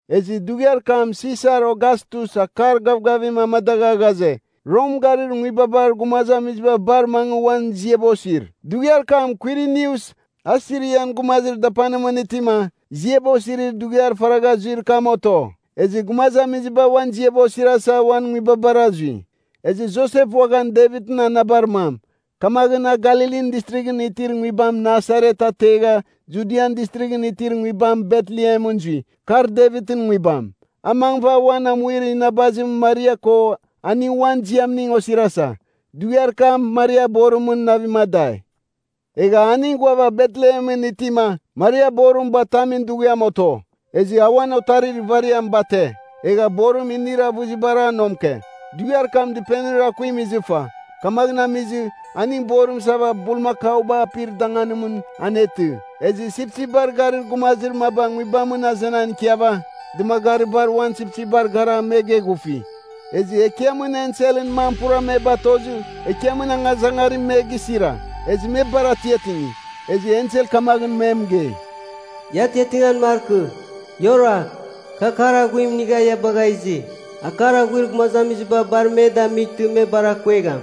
Ezɨ dughiar kam Sisar Ogastus akar gavgavim amadagha ghaze, “Rom garir nguibabar gumazamiziba bar mangɨ uan ziaba osir.” Dughiar kam Kwirinius, a Sirian gumazir dapanimɨn itima, ziaba osirir dughiar faragha zuir kam oto. Ezɨ gumazamiziba uan ziaba osirasa uan nguibabara zui. Ezɨ Josep uaghan Devitɨn anabar mam. Kamaghɨn a Galilin Distrighɨn itir nguibam Nasaret ategha, Judian Distrighɨn itir nguibam Betlehemɨn zui, kar Devitɨn nguibam. A mangɨva uan amuir inabazim Maria ko aning uan ziamning osirasa. Dughiar kam Maria borimɨn navim adai. Egha aning ghuava Betlehemɨn itima, Maria borim batamin dughiam oto. Ezɨ a uan otarir ivariam bate. Egha borim inir avɨzibar a nomke. Dughiar kam dɨpenir akuim izɨfa. Kamaghɨn amizɨ, aning borim isava bulmakauba apir danganimɨn anetɨ. Ezɨ sipsipbar garir gumazir maba nguibamɨn azenan ikiava, dɨmagaribar uan sipsipbar gara me geghufi. Ezɨ Ekiamɨn enselɨn mam pura me batozɨ, Ekiamɨn angazangarim me gisira. Ezɨ me bar atiatingi. Ezɨ ensel kamaghɨn me mɨgei, “Ia atiatingan markɨ. Ia oragh! Kɨ akar aghuim inigha ia bagha izi. Akar aghuir gumazamiziba bar me damightɨ, me bar akongegham.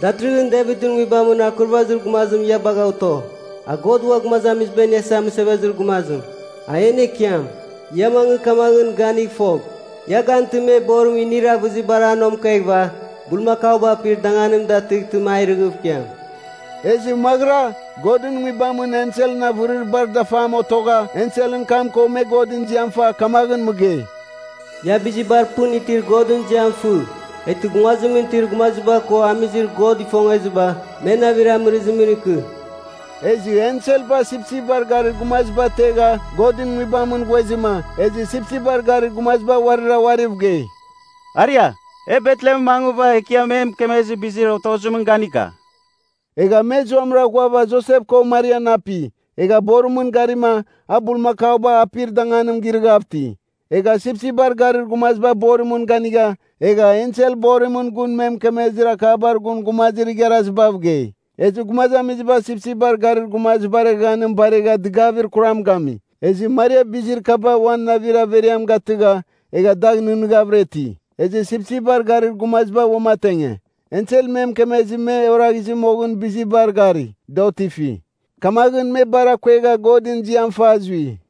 Datɨrɨghɨn Devitɨn nguibamɨn akurvazir gumazim ia bagha oto. A God Ua Gumazamiziba Iniasa Mɨsevezir Gumazim, a en Ekiam. Ia mangɨ kamaghɨn ganigh fogh, ia gantɨma me borim inir avɨzibar a nomkeghɨva bulmakauba apir danganim datɨghtɨma a irɨghɨv ikiam.” Ezɨ maghɨra, Godɨn nguibamɨn enselɨn avɨrir bar dafam otogha enselɨn kam ko me Godɨn ziam fa kamaghɨn mɨgei, “Ia bizibar pɨn itir Godɨn ziam fɨ. Eghtɨ nguazimɨn itir gumaziba ko amizir God ifongeziba, me navir amɨrɨzimɨn ikɨ.” Ezɨ enselba sipsipbar garir gumaziba ategha Godɨn nguibamɨn ghuezɨma, ezɨ sipsipbar garir gumaziba uarira uariv gei, “Aria, e Betlehemɨn mangɨva Ekiam e mɨkemezir bizir otozimɨn ganika.” Egha me zuamɨra ghuava Josep ko Marian api, egha borimɨn garima a bulmakauba apir danganim girɨghav iti. Egha sipsipbar garir gumaziba borimɨn ganigha, egha ensel borimɨn gun me mɨkemezir akabar gun gumazir igharazibav gei. Ezɨ gumazamiziba sipsipbar garir gumazibar eghaghanim baregha dɨgavir kuram gami. Ezɨ Maria bizir kaba uan navir averiam gatɨgha, egha dagh nɨghnɨghavɨra iti. Ezɨ sipsipbar garir gumaziba uamatenge. Ensel me mɨkemezɨ me oraghizɨ moghɨn bizibar gari, da otifi. Kamaghɨn me bar akuegha Godɨn ziam fa zui.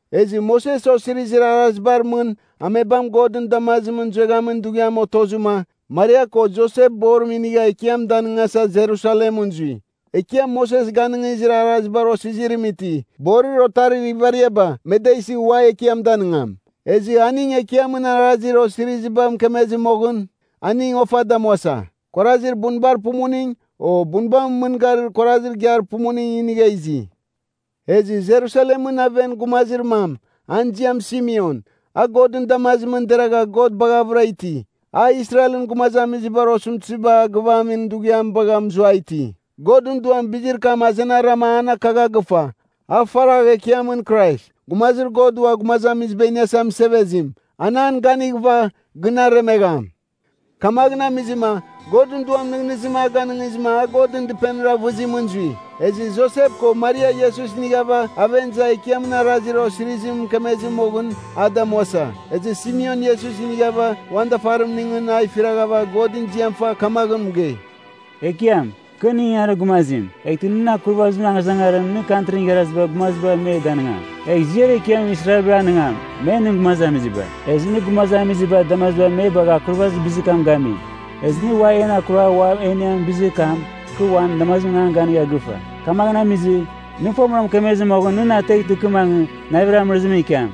Ezɨ Moses Osirizir Arazibar mɨn amebam Godɨn damazimɨn zueghamin dughiam otozɨma, Maria ko Josep borim inigha Ekiam danɨngasa Jerusalemɨn zui. Ekiam Moses ganɨngizir arazibar osizirim iti, borir otarir ivariaba me da isɨ ua Ekiam danɨngam. Ezɨ aning Ekiamɨn arazir osiriziba mɨkemezɨ moghɨn, aning ofa damuasa, kuarazir bunbar pumuning, o bunbamɨn mɨn gari kuarazir igiar pumuning inigha izi. Ezɨ Jerusalemɨn aven gumazir mam, an ziam Simeon, a Godɨn damazimɨn deragha God baghavɨra iti. A Israelɨn gumazamizibar osɨmtɨziba a gɨvamin dughiam bagha mɨzuai iti. Godɨn Duam bizir kam azenarama an akagha gɨfa, a faragh Ekiamɨn Krais (Gumazir God Ua Gumazamiziba Iniasa Mɨsevezim), an an ganighɨva, gɨn aremegham. Kamaghɨn amizɨma Godɨn Duam nɨghnɨzim a ganɨngizɨma a Godɨn Dɨpenir avɨzimɨn zui. Ezɨ Josep ko Maria Iesus inighava aven iza Ekiamɨn arazir osirizim mɨkemezɨ moghɨn, a damuasa. Ezɨ Simeon Iesus inighava uan dafarimningɨn a ifiraghava Godɨn ziam fa kamaghɨn mɨgei, “Ekiam, kɨ nɨn ingangarir gumazim. Eghtɨ nɨn akurvazimɨn angazangarim nɨ Kantrin Igharazibar Gumaziba me danɨngam. Egh ziar ekiam Israelbar anɨngam; me nɨn gumazamiziba. Ezɨ nɨ gumazamizibar damazibar me bagha akurvazir bizir kam gami. Ezɨ nɨ en akuragh ua e iniamin bizir kam, kɨ uan damazimɨn an ganigha gɨfa. Kamaghɨn amizɨ, nɨ fomɨra mɨkemezɨ moghɨn nɨ na ateghtɨ kɨ mangɨ, navir amɨrɨzimɨn ikiam.”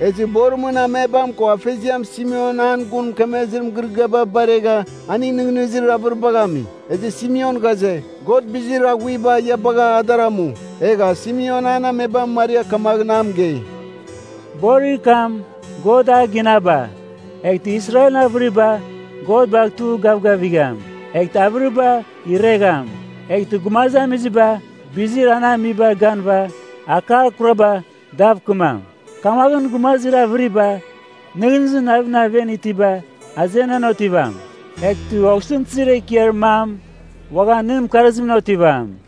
Ezɨ borimɨn amebam ko afeziam Simeon an gun mɨkemezir mɨgɨrɨgɨaba baregha aning nɨghnɨzir avɨribagh ami. Ezɨ Simeon ghaze, God bizir aghuiba ia bagh a dar amu, egha Simeon an amebam Maria kamaghɨn a mɨgei, “Borir kam God a ginaba, eghtɨ Israelɨn avɨriba God bagh tugh gavgavigham. Eghtɨ avɨriba iregham. Eghtɨ gumazamiziba bizir an amibar ganɨva akar kurabar dav kɨmam. Kamaghɨn gumazir avɨribar nɨghnɨzir navimɨn aven itiba azenan otivam. Eghtɨ osɨmtɨzir ekiar mam uaghan nɨn mɨkarzimɨn otivam.”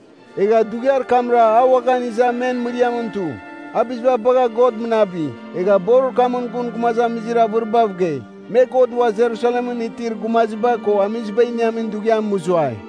Egha dughiar kamra a uaghan iza men mɨriamɨn tu. A biziba bagha God mɨnabi. Egha borir kamɨn gun gumazamizir avɨribav gei, me God ua Jerusalemɨn itir gumaziba ko amiziba iniamin dughiam mɨzuai.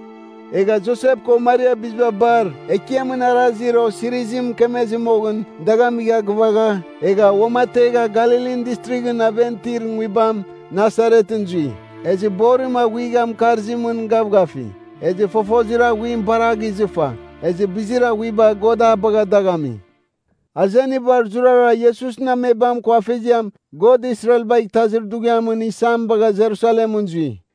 Egha Josep ko Maria biziba bar Ekiamɨn arazir osirizim mɨkemezɨ moghɨn dagh amigha gɨvagha, egha uamategha Galilin Distrighɨn aven itir nguibam Nasaretɨn zui. Ezɨ borim aghuiga mɨkarzimɨn gavgafi. Ezɨ fofozir aghuim bar a gizɨfa. Ezɨ bizir aghuiba God a bagha dagh ami. Azeniba zurara Iesusɨn amebam ko afeziam, God Israelbagh Itazir Dughiamɨn Isam bagha Jerusalemɨn zui.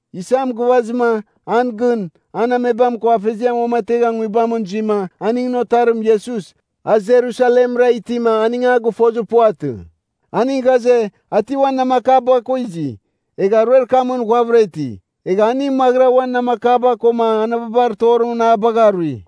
Isam gɨvazɨma, an gɨn, an amebam ko afeziam uamategha nguibamɨn zuima, aningɨn otarim Iesus, a Jerusalemra itima aning a gɨfozir puvatɨ. Aning ghaze, a ti uan namakaba ko izi. Egha aruer kamɨn ghuavɨra iti. Egha aning maghɨra uan namakaba koma anababar torimɨn a bagha rui.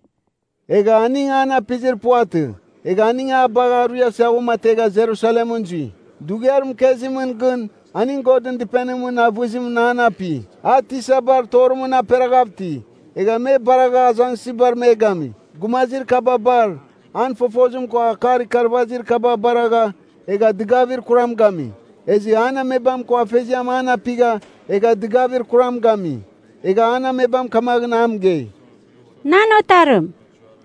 Egha aning an apizir puvatɨ, egha aning a bagh ruiasa uamategha Jerusalemɨn zui. Dughiar mɨkezimɨn gɨn aning Godɨn Dɨpenimɨn avɨzimɨn an api. A tisabar torimɨn aperaghav iti, egha me baragha azangsɨzibar me gami. Gumazir kaba bar an fofozim ko akar ikarvazir kaba baragha egha dɨgavir kuram gami. Ezɨ an amebam ko afeziam an apigha, egha dɨgavir kuram gami. Egha an amebam kamaghɨn a mɨgei, “Nan otarim,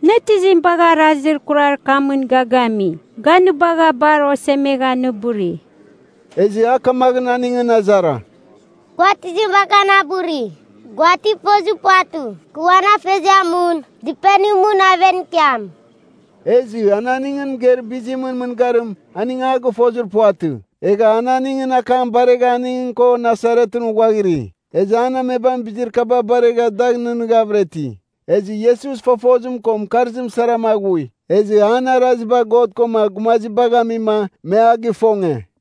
nɨ tizim bagha arazir kurar kamɨn ga gami? Ga nɨ bagha bar osemegha nɨ buri.” Ezɨ a kamaghɨn aningɨn azara, “Gua tizim bagha na buri? Gua ti fozir puvatɨ, kɨ uan Afeziamɨn Dɨpenimɨn aven ikiam?” Ezɨ an aningɨn mɨgeir bizimɨn mɨngarim aning a gɨfozir puvatɨ. Egha a aningɨn akam baregha aning ko Nasaretɨn uaghiri. Ezɨ an amebam bizir kaba baregha dagh nɨghnɨghavɨra iti. Ezɨ Iesus fofozim ko mɨkarzim sarama aghui. Ezɨ an araziba God koma gumazibagh amima, me a gifonge.